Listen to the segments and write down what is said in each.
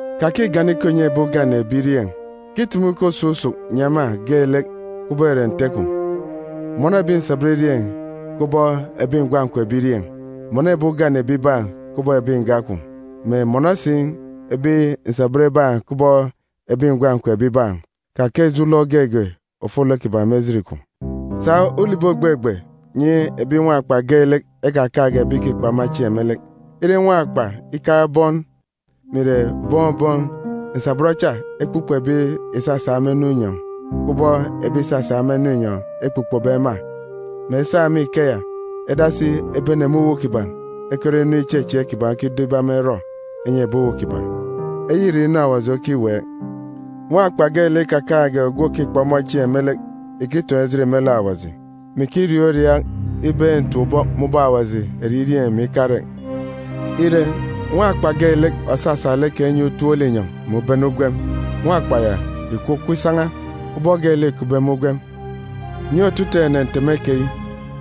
Kakigana ikọ ìnyi ebi ugane ebirieen̄, kitumu ikọ ususuk nyi ema geelek kubọk ìre nte kwun̄. Mọnọ ebi nsabọn irieen̄ kubọk ebi ngwan̄ kwun̄ ebirieen̄. Mọnọ ebi ugane ebibaan̄ kubọk ebi nga kwun̄, mè mọnọ si ebi nsabọn ibaan̄ kubọk ebi ngwan̄ kwun̄ ebibaan̄, kakaan̄ ijo ulọk geege ofolek kiban̄ me ejit kwun̄. Sa ulibi ògbegbe nyi ebi nwakpa geelek ekakaan̄ge ebi ìkikpọ ema chieen̄ me lek. Ire nwakpa ikaan̄ bọn mè ìre bọn bọn, nsabọn cha ekpukpo ebi ìsasa ema inu inyọn̄, kubọk ebi ìsasa ema inu inyọn̄ ekpukpobe ema, mè esa me ikeya edasi ebene me uwu kiban̄ ekerọ inu ichechieek kiban̄ okido ibe ema erọ enyi ebi uwu kiban̄. Eyi ìre inu Awaji okiweek. Nwakpa geelek ikakaan̄ge ogwu òkikpọ ọmọ chieen̄ me lek ìkitoon̄ ejit me lek Awaji, mè ikiriaak uriaak ibeek ntap-ubọk me ubọk Awaji eririeen̄ mè ikarek. Ire, nwakpa geelek òsasa lek kan̄ inyi utop linyọn̄ mè ubene ugwem, nwakpa keya ìkwukwu isan̄a, ubọk geelek îkupbe me ugwem. Nyi otutuuk ene nteme keyi,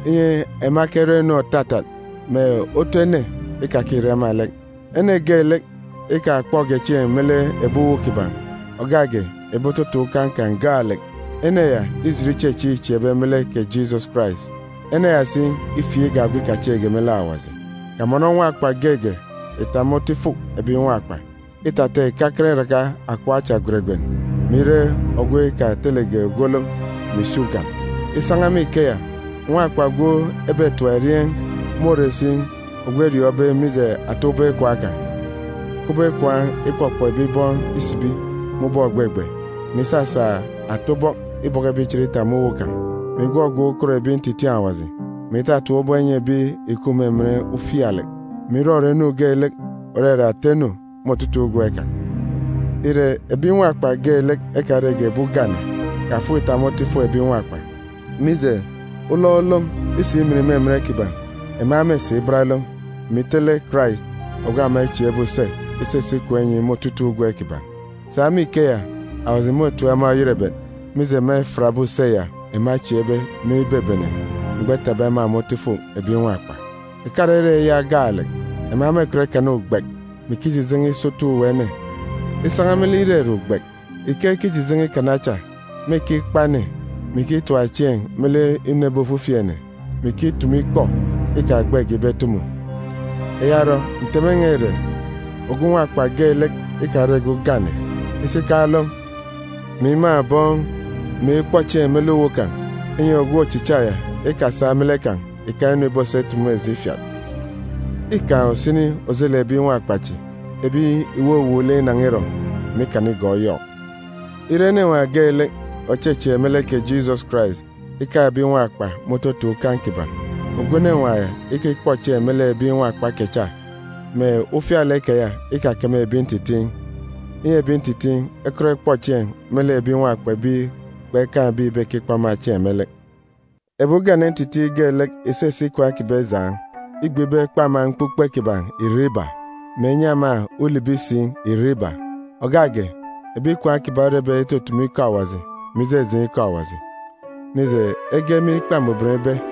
inyi ema ekerọ inu òtatat, mè otu ene ikakire ema lek. Ene geelek ikakpọge chieen̄ me lek ebi uwu kiban̄, ògak ge ebi ototun̄ ukan̄ kan̄ gaalek, ene ya îjit ichechieek îchieekbe me lek kè Jisọs Karais. Ene ya si îfieek igak ogwu ikachieekge me lek Awaji. Kamọnọ nwakpa geege ìtap me otu ifuk ebi nwakpa, îtata ìkakan iraka akọp acha gweregwen, mè ire ogwu ikatelege ogwu olom, mè ìsi ugan. Isan̄a me ikeya, nwakpa ogwu ebetap erieen̄ môre si ogwu eriọọn̄be mije ata ubọk ikwaan̄ kan̄, kubọk ikwaan̄ ikpọkpọ ebi bọn isibi me ubọk ògbegbe, mè isasa ata ubọk ibọkọ ebi ichen itap me uwu kan̄, mè igwọgwọk ukot ebi ntitiin̄ Awaji, mè itatap ubọk inyi ebi ìkup me emen ufialek, mè irọrọ inu geelek òrere ata inu me otutuuk ugwem kan̄. Ire, ebi nwakpa geelek ekarege ebi ugane, kafuk ìtap me otu ifuk ebi nwakpa, mije, ulọk olom isimin me emen kiban̄, ema mêsi ibat olom, mè itele Karais ogwu ema echieekbe use isisi ikwaan̄ inyi me otutuuk ugwem kiban̄. Sa me ikeya, Awaji môtip ema oyerebet, mije ema efiatbe use ya ema echieekbe me ibebene mgbọ etapbe ema me otu ifuk ebi nwakpa. Ìkarere eya gaalek, ema mêkọt ikana ugbek, mè ikijijen̄e isotu uwu ene. Isan̄a me lek irere ugbek, ike ekijijen̄e ikana cha, mêkikpa ene, mè ikitap chieen̄ me lek inu ebi ofifi ene, mè ikitumu ikọ ikagbege ibe etumu. Eya orọ, nteme n̄a ìre, ogwu nwakpa geelek ikarege ugane, isi ikaan̄ olom, mè imaan̄ bọn, mè ikpọ chieen̄ me lek uwu kan̄, inyi ogwu ochicha ya ikasa me lek kan̄ ìkaan̄ inu ìbosa itumu eji ifiat. Îkaan̄ usini ojelek ebi nwakpa chi ebi ìwuwuuk lek inan̄a irọn̄, mè ikana igọọk Yọk. Ire enenwaan̄ geelek òchechieek me lek kè Jisọs Karais ikaan̄ ebi nwakpa me ototun̄ ukan̄ kiban̄, ogwu enenwaan̄ ya ikikpọ chieen̄ me lek ebi nwakpa kecha, mè ufialek keya ikakeme ebi ntitiin̄, inyi ebi ntitiin̄ ekọt ekpọ chieen̄ me lek ebi nwakpa ebi kpekaan̄ ebi ìbekikpọ ema chieen̄ me lek. Ebi ugane ntitiin̄ geelek ìsisi ikwaan̄ kiban̄ ijaan̄, îgbe ibe ekpe ema mkpukpe kiban̄ irek iba, mè enyi ema ulibi si irek iba, ògak ge ebi ikwaan̄ kiban̄ orebe itutumu ikọ Awaji mè ijejeen̄ ikọ Awaji, mije, ege me Ikpa Mbuban ibe,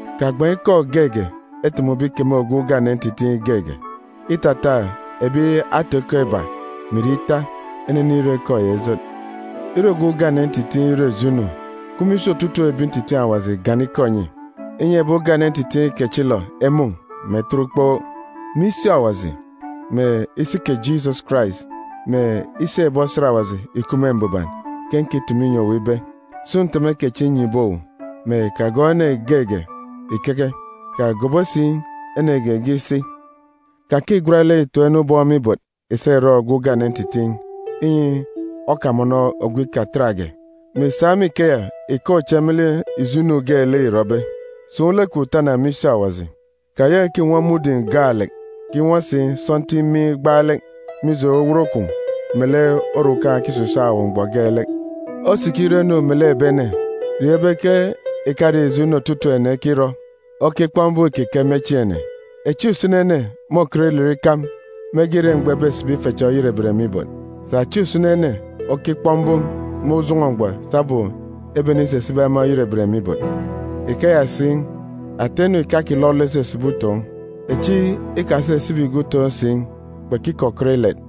Kagban̄ ikọ geege etumube ikeme ogwu ugane ntitiin̄ geege, îtata ebi ata-ikọ iba mè ìre ita enenirọ ikọ ya ijot. Ire ogwu ugane ntitiin̄ irọ ijo inu, kup me isi otutuuk ebi ntitiin̄ Awaji gana ikọ nyi, inyi ebi ugane ntitiin̄ kechilọ emun̄, mè etet ukpook. Me isi Awaji, mè isi kè Jisọs Karais, mè isi ebi osat Awaji ìkup me mbuban ke nkitumu inyi owu ibe, sun̄ nteme kechi nnyibe owu, mè kagọọk ene geege ìkeke, kagobo si ene geege isi. Kakigwat lek ìtoon̄ ene ubọk me ibot ìsa ìrọ ogwu ugane ntitiin̄, inyi okamọnọ ogwu ikatatge, mè ìsa me ikeya ìkaan̄ uche me lek ijo inu geelek îrọbe. Sun̄ lek kwun̄ tana me isi Awaji. Kayaka ìkinwọ mudim gaalek, kinwọ si sọntiik miin̄ gbaalek, mije owot kwun̄ melek orukan̄ òkisisaak owu mgbọ geelek. Osikirọ inu melek ebi ene, riọọn̄ ibe ke ìkare ijo inu otutuuk ene ekirọ okikpọk mbum ìkike me chieen̄ ene. Echi usini ene môkọt ilet ikam mege ire mgbọ ebesibi ife cha oyerebet me ibot. Sà echi usini ene okikpọk mbum me ujọn̄ọ mgbọ sabum ebenisisibi ema oyerebet me ibot. Ikeya si, ata inu ìkakilọlọ isisibi utoon̄. Echi ikasisibige utoon̄ si, kpekikọkọt ilet.